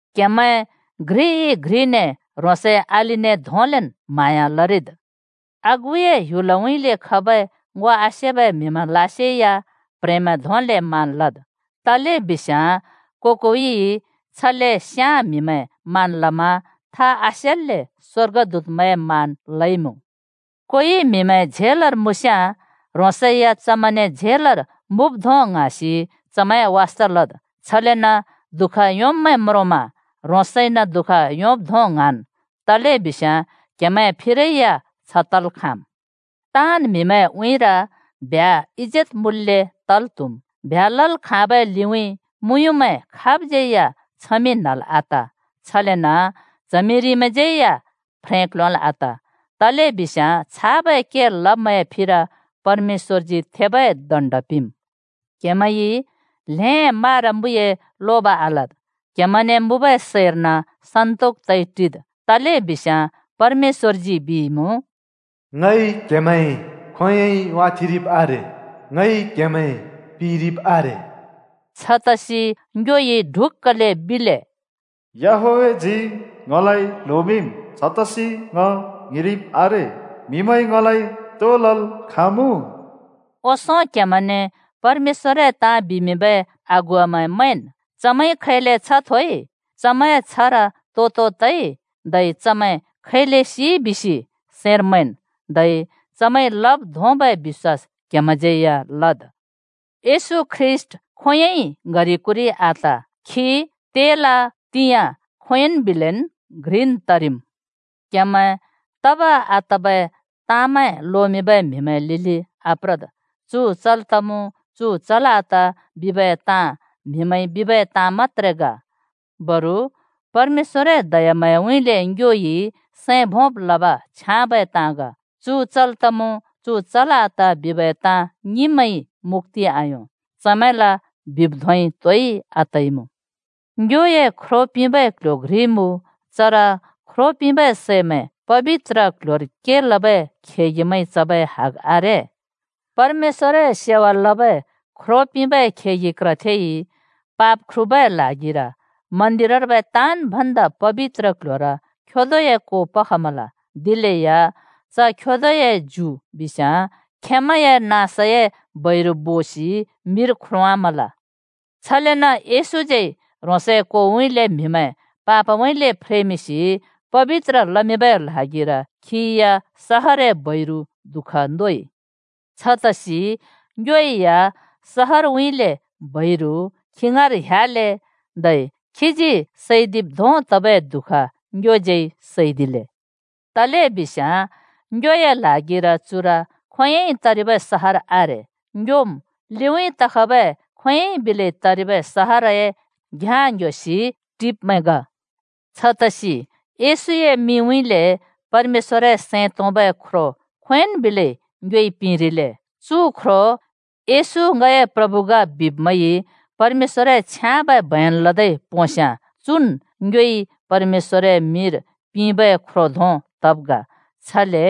क्हेमैं घ्रिइ-घ्रिने ह्रोंसए अलिने धोंलेन् म्हाँया लरिद्। आगुए ह्‍युलउँइँले खबै ङो आसेबै म्‍हिमैंलासे या प्ह्रेंमैं धोंले मान लद्, तलेबिस्याँ को-कोइइ छले स्‍याँ म्‍हिमैं मान लमा था आसेल्‍ले स्‍वर्गदूतमैंए मान लइमुँ। कोइ म्हिमैं झेलर मुँस्याँ ह्रोंसै या चमैंने झेलर मुँब् धों ङ्हाँसि चमैंए वास्था लद्। छलेन दुःख योंब्मैं म्रोंमा ह्रोंसइन दुःख योंब् धों ङ्हाँन्। तलेबिस्याँ क्हेमैं फिरै या छ तल् खाँम्। ताँन् म्हिमैंए उँइँर ब्ह्‍या इजेत मुँल्‍ले तल् त्हुम्। ब्ह्‍या लल् खाँबै लिउँइँ मुँयुँमैं खाबज्यै या छमिं न्हल् आत, छलेन च्हमिरिमैंज्यै या फ्रें क्ल्योंल् आत, तलेबिस्याँ छाबै के लब्मैंए फिर परमेश्‍वरजी थेबै दण्ड पिंम्। क्‍हेमैंइ ल्हें मारा-मुइए लोब आलद्। क्हेमैंने मुँबै सैर्न सन्‍तोक तइ टिद्। तलेबिस्याँ परमेश्‍वरजी बिइमुँ, “ङइ क्‍हेमैं खोंयोंइ वाथेंरिब् आरे, ङइ क्हेमैं पिरिब् आरे।” छतसि ङ्योइ ढुक्‍कले बिले, “याहवेहजी ङलाइ ल्होमिंम्, छतसि ङ ङ्हिंरिब् आरे। म्‍हिमैंइ ङलाइ तो लल् खाँमुँ?” ओंसों क्‍हेमैंने परमेश्‍वरए ताँ बिमिंबै अगुवामैं मैंन्। चमैंइ खैले छ्ह थोइ, चमैंए छ्हर तो-तो तइ धै चमैं खैले सिइ बिसि सैंर मैंन्, धै चमैंइ लब् धोंबै बिश्‍वास क्‍हेमैंज्यै या लद्। येशू ख्रीष्‍ट खोंयोंन् बिलै ङ्‍हरि-कुरि आत! खी तेला, तिंयाँ, खोंयोंइ बिलेन् घ्रिन् तरिम्। क्‍हेमैं तब आतबै ताँमैं लोमिंबै म्हिमैंए लिलि आप्रद्। चु चल् तमु, चु चल् आत िबबै ताँ म्हिमैंइ बिबै ताँ मत्‍त्रे ग, बरु परमेश्‍वरए दयाम्हाँयाउँइँले ङ्योइ सैं भोंब् लबै ताँ छ्याँबै मुँ। चु चल् तमु, चु चल् आत िबबै ताँ ङिंब्मैंइ मुक्‍ति आयों, चमैंला बिब् धोंइ तोइ आतइमुँ। ङ्योए ख्रो पिंबै क्‍ल्‍ह्‍यो घ्रि मुँ। चर ख्रो पिंबै सैमैं पबित्र क्ल्ह्‍योर के लबै खेगिमैंइ चबै हग आरे। परमेश्‍वरए सेवा लबै ख्रो पिंबै खेगि क्रथेइ पाप ख्रुबै ल्हागिर मन्‍दिरर्बै “ताँन् भन्दा पबित्र क्‍ल्‍ह्‍योर” खेदोए को पखमल, दिलेया च खेदोए ज्यु बिस्याँ खेंमैंए नाँसए बैरु बोसि मिर ख्रोंवामल। छलेन येशूज्यै खीए ह्रोंसए कोउँइँले म्‍हिमैं पापउँइँले फ्रेमिंसि पबित्र लमिंबै ल्हागिर खिइ या सहरए बैरु दु:ख नोइ। छतसि ङ्यो या सहरउँइँले बैरु खी ङाँर ह्‍याले, धै खीजी सैदिब् धों तबै दुःख ङ्योज्यै सैदिले। तलेबिस्याँ ङ्योए ल्हागिर चुर खोंयोंइ तरिबै सहर आरे। ङ्योम् लिउँइँ तखबै खोंयोंइ बिलै तरिबै सहरए घ्याँ ङ्‍ह्‍योसि टिब्मैं ग। छतसि येशूए मिंउँइँले परमेश्‍वरए सैं तोंबै ख्रो खोंयोंन् बिलै ङ्योइ पिंरिले। “येशू ङए प्रभु ग,” बिब्मैंइ परमेश्‍वरए छ्याँबै बयन लदै पोंस्याँ, चुन् ङ्योइ परमेश्‍वरए मिंर पिंबै ख्रो धों तब् ग। छले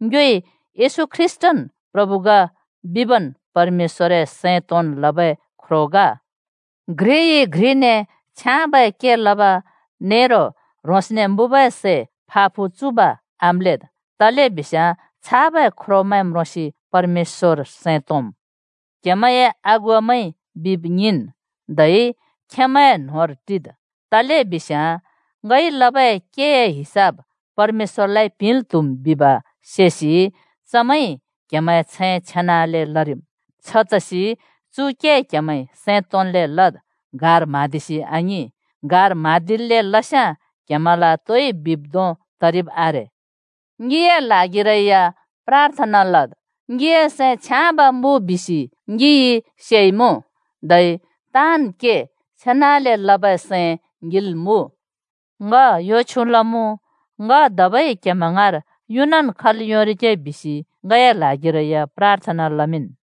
ङ्योइ येशू ख्रीष्‍टन् प्रभु ग बिबन् परमेश्‍वरए सैं तोंन् लबै ख्रो ग। घ्रिइ घ्रिने छ्याँबै के लब नेरो ह्रोंसने मुँबै सै फा-फु चुब आम्‍लेद्, तलेबिस्याँ छाबै ख्रोमैं म्रोंसि परमेश्‍वर सैं तोंम्। क्‍हेमैंए अगुवामैंइ बिब ङिंन्, धै खेंमैंए न्होंर टिद्। तलेबिस्याँ “ङइ लबै केए हिसाब परमेश्‍वरलाइ पिंल् त्‍हुम्” बिब सेसि चमैंइ क्‍हेमैंए छैं छेनाले लरिम्। छतसि चु के चमैंइ सैं तोंन्ले लरिगे, गार म्हाँदिसि आङिं। चमैंइ गार म्हाँदिल्‍ले के लस्याँ क्‍हेमैंला तोइ बिब् धों तरिब् आरे। ङिए ल्हागिरै या प्राथना लद। ङिए सैं छ्याँब मुँ बिसि ङिइ सेइमुँ, धै ताँन् के छेनाले लबै सैं ङिल मुँ। ङ यो छ्यु लमुँ, ङ धबै क्‍हेमैं ङाँर युनन् खल् योंरिगे बिसि ङए ल्हागिरै या प्राथना लमिंन्।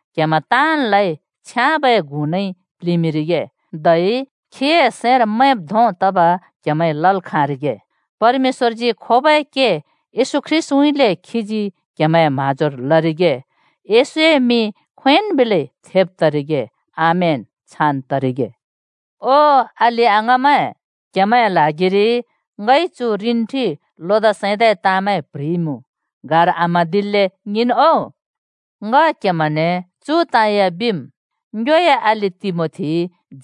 क्‍हेमैं ताँनलाइ छ्याँबै गुनइ प्लिंमिंरिगे, धै खीए सैंर मैंब् धों तब क्हेमैंइ लल् खाँरिगे। परमेश्‍वरजी खोबै के येशू ख्रीष्‍टउँइँले खीजी क्हेमैंए म्हाँजोर लरिगे। येशूए मिं खोंयोंन् बिलै थेब तरिगे। आमेन, छान् तरिगे। ओ ङए अलि-अङाँमैं, क्हेमैंए ल्हागिरि ङइ चु रिन्ठि लोदा सैंदाए ताँमैं प्ह्रिइमुँ। गार आम्हाँदिल्‍ले ङिंन् ओ। ङ क्‍हेमैंने चु ताँ या बिम्: ङ्योए अलि तिमोथी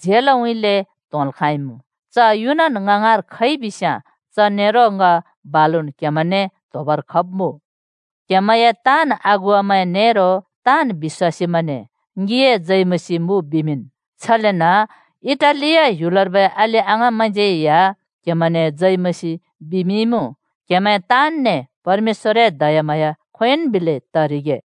झेलउँइँले त्‍होंल् खाँइमुँ। च युनन् ङ ङाँर खइ बिस्‍याँ च बालुन् ङ क्‍हेमैंने त्‍होबर खब्‍मुँ। क्‍हेमैंए ताँन् अगुवामैं नेरो ताँन् बिश्‍वासीमैंने ङिए जय मसीह मुँ बिमिंन्। छलेन इटालिया ह्‍युलर्बै अलि-अङाँमैंज्यै या क्‍हेमैंने जय मसीह बिमिंइमुँ। क्‍हेमैं ताँनने परमेश्‍वरए दयाम्हाँया खोंयोंन् बिलै तरिगे।